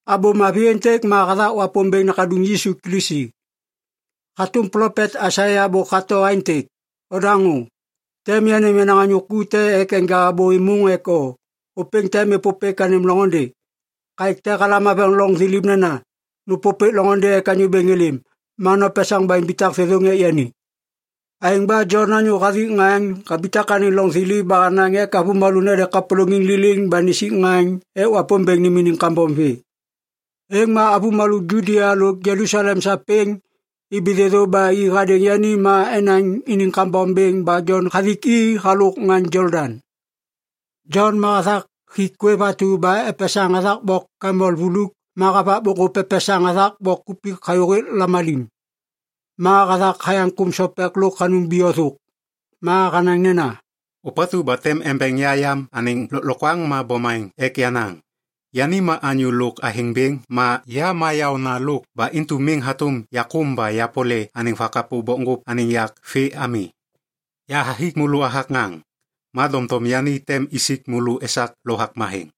Abô Mavi êntêk ma hathak Wapômbêŋ nakaduŋ Yisu Kilisi. Hatôm plopet Aisaia bôk hato aêntêk, “Ondaŋô! Tem yanêm yenaŋ anyô ku te ek enja abô êmôŋ ek o, ôpêŋ tem êpôpêk anêm loŋôndê. Kaêk te halam haveŋ loŋ thiliv nena, ‘Nôpôpêk loŋôndê ek Anyô Bêŋ êlêm, ma nopesaŋ ba imbitak thêthôŋ ek yani.’” Aêŋ ba Jon anyô hathik ŋaŋ habitak anêŋ loŋ thiliv ba hanaŋ ek avômalô nede kapôlôŋiŋ liliŋ ba nisik ŋaŋ ek Wapômbêŋ nêm iniŋ kambom vê. Êŋ ma avômalô Judia lo Jelusalem sapêŋ ibi thêthô ba i hadêŋ yani ek enaŋ iniŋ kambom bêŋ. Ma Jon hathik i halôk ŋaŋ Jolodaŋ. Jon ma hathak hik kwêv atu ba epesaŋ hathak bok kamel vuluk ma havak bokŋgôp epesaŋ hathak bok kupik hayôhêk lamalim. Ma hathak hayaŋ kôm sopek lôk hanum biyo thôk. Ma hanaŋ nena, “Ôpatu ba tem embeŋ ya yam anêŋ lôklokwaŋ ma bomaŋ ek yenaŋ. Yani ma anyô lôk athêŋ bêŋ ma ya ma yaônalôk ba intu miŋ hatôm yakôm ba yapole anêŋ vakapô bokŋgôp anêŋ yak vê ami. Yahathik môlô hathak ŋaŋ. Ma doŋtom yani tem isik môlô esak Lovak Matheŋ.”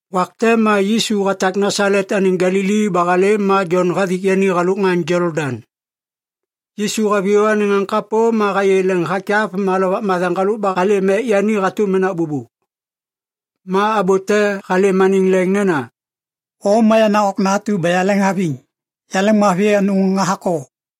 Wak te ma Yisu hatak Nasalet anêŋ Galili ba halêm ma Jon hathik yani halôk ŋaŋ Jolodaŋ. Yisu haviyô anêŋ ŋaŋ kapô ma hayê leŋ hakyav ma Lovak Matheŋ halôk ba halêm ek yani hatôm menak bôbô. Ma abô te halêm anêŋ leŋ nena, “O ma yenaŋ Okna atu ba yaleŋhaviŋ. Yaleŋmavi anôŋ hathak o.”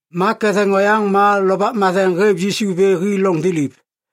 Ma ketheŋ oyaŋ ma Lovak Matheŋ hêv Yisu vê hi loŋ thiliv.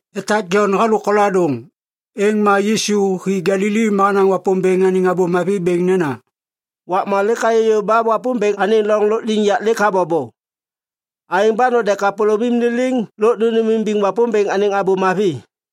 Etak Jon halôk koladôŋ, êŋ ma Yisu hi Galili ma hanaŋ Wapômbêŋ anêŋ Abô Mavi bêŋ nena, “Wakma lêk hayô yôv ba Wapômbêŋ anêŋ loŋ lôkliŋyak lêk habobo. Aêŋ ba node kapôlômim liliŋ lôk nônêmimbiŋ Wapômbêŋ anêŋ Abô Mavi!”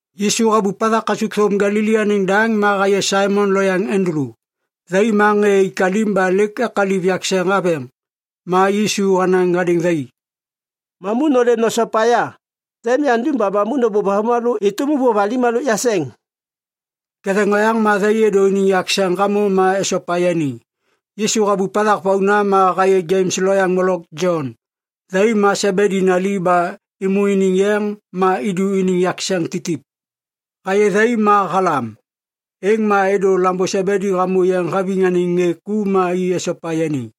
Yisu habup hathak kasukthôm Galili anêŋ daŋ ma hayê Saimon lo yaŋ Andulu. Thai ma ŋê ik alim ba lêk ekaliv yakseŋ haveŋ. Ma Yisu hanaŋ hadêŋ thai, “Mamu nôlêm nosopa ya. Tem yandum ba mamu nôbôv avômalô êtôm ôvôv alim halôk yakseŋ.” Ketheŋ oyaŋ ma thai êdô iniŋ yakseŋ hamô ma esopa yani. Yisu habup hathak vauna ma hayê Jems lo Jon. Thai ma Sebedi nali ba êmô iniŋ yeŋ ma idu iniŋ yakseŋ titip. Hayê thai ma halam, êŋ ma êdô lambô Sebedi hamô yeŋ haviŋ anêŋ ŋê ku, ma i esopa yani.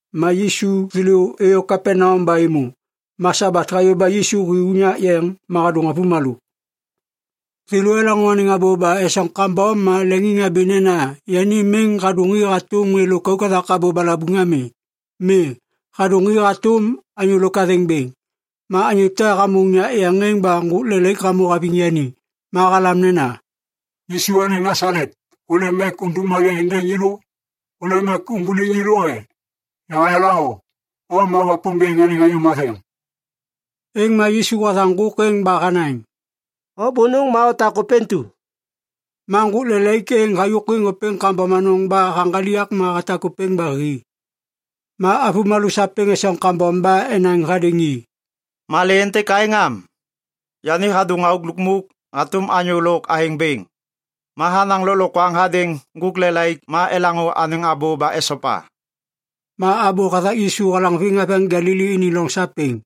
Ma Yisu thêlô êyô Kapaneam ba êmô. Ma Sabat hayô ba Yisu hi unyak yeŋ ma hadôŋ avômalô. Thêlô elaŋô anêŋ abô ba esoŋ kambom ma leŋiŋhabi nena yani miŋ hadôŋ i hatôm ŋê lôkauk hathak abô balabuŋ ami. Mi, hadôŋ i hatôm anyô lôk athêŋ bêŋ. Ma anyô te hamô unyak yeŋ êŋ ba ŋgôk lelaik hamô haviŋ yani. Ma halam nena, “Yisu anêŋ Nasalet, hôlêm ek udum malê êndêŋ yêlô? Hôlêm ek umbuliŋ yêlô e? Yahayala o. O ma Wapômbêŋ anêŋ Anyô Matheŋ.” Êŋ ma Yisu hathaŋ ŋgôk êŋ ba hanaŋ, “O bônôŋ ma otak ôpêntu!” Ma ŋgôk lelaik êŋ hayôkwiŋ ôpêŋ kambom anôŋ ba haŋgaliak ma hatak ôpêŋ ba hi. Ma avômalô sapêŋ esoŋ kambom ba enaŋ hadêŋ i, “Malê êntêk aêŋ am? Yani hadôŋ auk lukmuk hatôm anyô lôk athêŋ bêŋ. Ma hanaŋ lôklokwaŋ hadêŋ ŋgôk lelaik ma elaŋô anêŋ abô ba esopa.” Ma abô hathak Yisu halaŋviŋ haveŋ Galili iniŋ loŋ sapêŋ.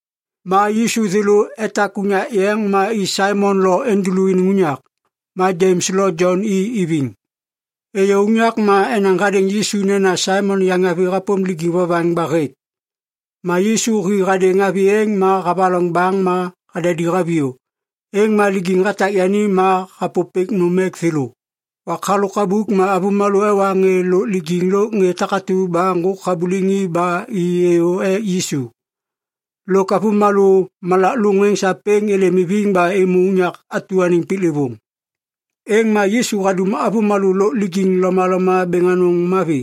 Ma Yisu thêlô etak unyak yeŋ, ma i Saimon lo Andulu iniŋ unyak. Ma Jems lo Jon i iviŋ. Êyô unyak, ma enaŋ hadêŋ Yisu nena Saimon yaŋavi hapôm lijiŋ vovaŋ ba hêk. Ma Yisu hi hadêŋ avi êŋ ma havaloŋ baŋ ma hadadi haviyô. Êŋ ma lijiŋ hatak yani ma hapôpêk nôm ek thêlô. Wak halôk abuk ma avômalô ewa ŋê lôk lijiŋ lôk ŋê takatu ba ŋgôk habuliŋ i ba êlêm ek Yisu. Lôk avômalô malak lôŋ êŋ sapêŋ êlêm iviŋ ba êmô unyak anêŋ piklêvôŋ. Êŋ ma Yisu hadum avômalô lôk lijiŋ lomaloma bêŋ anôŋ mavi.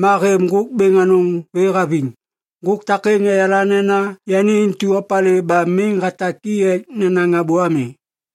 Ma hêv ŋgôk bêŋ anôŋ vê haviŋ. Ŋgôk takêŋ eyala nena yani intu opalê ba miŋ hatak i ek nenaŋ abô ami.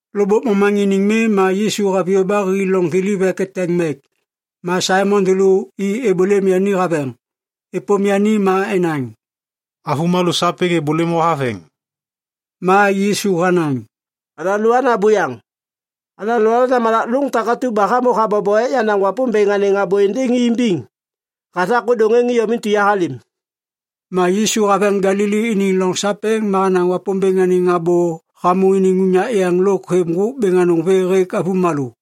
Lôkbôk momaŋiniŋ mi ma Yisu haviyô ba hi loŋ thiliv ek eteŋ mek. Ma Saimon thêlô i êbôlêm yani haveŋ. Êpôm yani ma enaŋ, “Avômalô sapêŋ êbôlêm o haveŋ.” Ma Yisu hanaŋ, “Alôana buyaŋ. Alôana malak lôŋ takatu ba hamô habobo ek yanaŋ Wapômbêŋ anêŋ abô êndêŋ i imbiŋ. Hathak ôdôŋ êŋ iyom intu yahalêm.” Ma Yisu haveŋ Galili iniŋ loŋ sapêŋ ma hanaŋ Wapômbêŋ anêŋ abô hamô iniŋ unyak yeŋ lôk hêv ŋgôk bêŋ anôŋ vê hêk avômalô.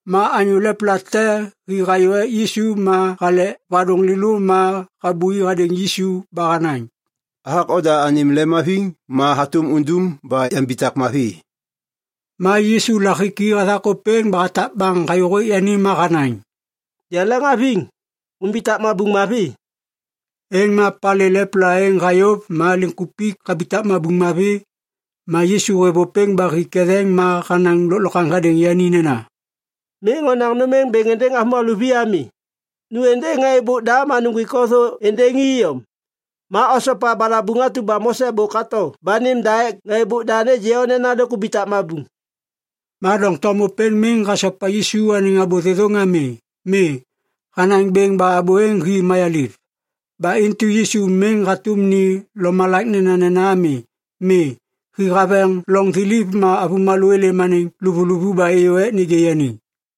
Ma anyô lepla te hi hayô ek Yisu ma halek vadôŋ lêlô ma habui hadêŋ Yisu ba hanaŋ, “Hathak oda anêm lemhaviŋ, ma hatôm undum ba yambitak mavi.” Ma Yisu lahiki hathak ôpêŋ ba hatak baŋ hayôhêk yani ma hanaŋ, “Yaleŋhaviŋ. Umbitak mabuŋ mavi.” Êŋ ma palê lepla êŋ hayôv ma liŋkupik habitak mabuŋ mavi. Ma Yisu hêv ôpêŋ ba hi ketheŋ ma hanaŋ lôklokwaŋ hadêŋ yani nena, “Miŋ onaŋ nôm êŋ bêŋ êndêŋ avômalô vi ami. Nu êndêŋ ŋê êbôk da ma nuŋgwik o thô êndêŋ i iyom. Ma osopa balabuŋ atu ba Mose bôk hato ba nêm da ek ŋê êbôk da nêgê o nena lêk hubitak mabuŋ.” Ma doŋtom ôpêŋ miŋ hasopa Yisu anêŋ abô thêthôŋ ami. Mi, hanaŋ bêŋ ba abô êŋ hi mayaliv. Ba intu Yisu miŋ hatôm ni lomalak nenanena ami. Mi, hi haveŋ loŋ thiliv, ma avômalô êlêm anêŋ luvuluvu ba êyô ek nêgê yani.